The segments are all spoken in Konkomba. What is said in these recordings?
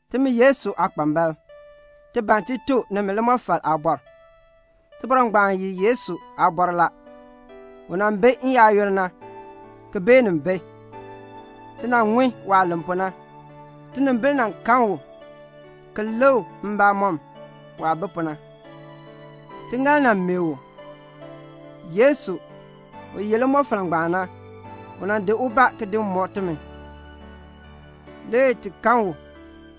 Timi Yesu aakpambalb, ti ban ti tuk nimi limɔfal aabɔr. Tibɔr ngbaan ye Yesu aabɔr la. N-yoonn mɔmɔk u nan bi. Ti nan ŋun waah len pu na. Tinimbil nan kan u, ki lik mbamɔm waah bi pu na. Tiŋaal nan meeh u. Yesu, u ye limɔfal ngbaan na, u nan di ubaa ki di mɔk timi. Le ti kan u.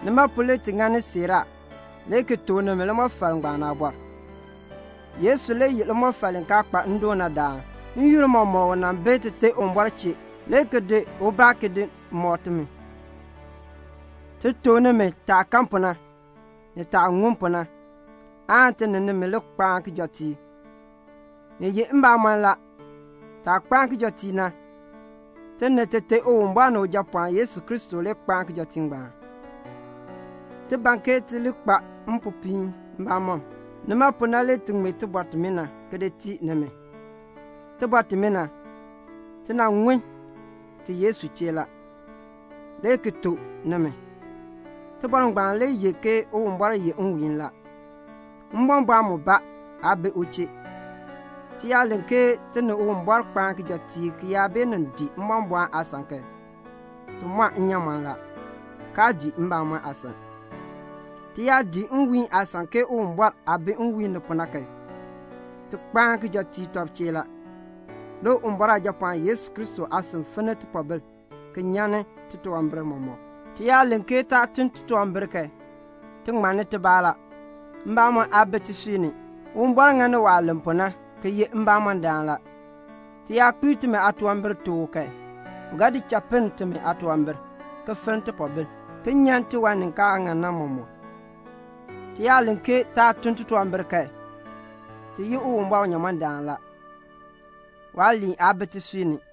Nima pu le ti ŋani siiraa, le ki tuk nimi limɔfal ngbaan aabɔr. Yesu le ye limɔfal li kaa kpa ndoon na daan. N-yoonn mɔmɔk u nan bi Tite Uwumbɔr chee, le ki di ubaa ki nan mɔk timi. Ti tuk nimi taah kan pu na, ni taah ŋun pu na, aan ti ni nimi li kpaan kijɔteek. Ni ye mbamɔn la, taah kpaan kijɔteek na, ti ni Tite Uwumbɔr ni Ujapɔɔn Yesu Kristo le kpaan kijɔteek ngbaan. Ti ban ke ti li kpa mpopiin mbamɔm. Nima pu na le ti ŋmee tibɔr timina ki di tii nimi. Tibɔr timina, ti nan ŋun ti Yesu chee la, le ki tuk nimi. Tibɔr ngbaan le ye ke Uwumbɔr ye nwiihn la. Mbɔmbɔɔn mubaa aa bi u chee. Ti yaa len ke ti ni Uwumbɔr kpaan kijɔteek ki yaa beenin dii mbɔmbɔɔn aasan kan, ti mɔn nnyaamɔn la, kaa dii mbamɔn aasan. Ti yaa dii nwiihn aasan ke Uwumbɔr aah bi nwiihn ni pu na kan, ti kpaan kijɔteek tɔb chee la. Le Uwumbɔr Aajapɔɔn Yesu Kristo aasin finni tipoobil ki nyan titunwambir mɔmɔk. Ti yaa len ke taa ye titunwambirdam kan, ti ŋmanni tibaa la; mbamɔn aa bi tisui ni. Uwumbɔr ŋani waah len pu na ki ye mbamɔndaan la. Ti yaa kpiir timi aatunwambir tuk u kan, u ga di cha pinn timi aatunwambir, ki finn tipoobil, ki nyan tiwan ni kaa ŋan na mɔmɔk. Ti yaa len ke taa tun titunwambir kan, ti yi Uwumbɔr unyamɔndaan la. Waaliin aa bi tisui ni.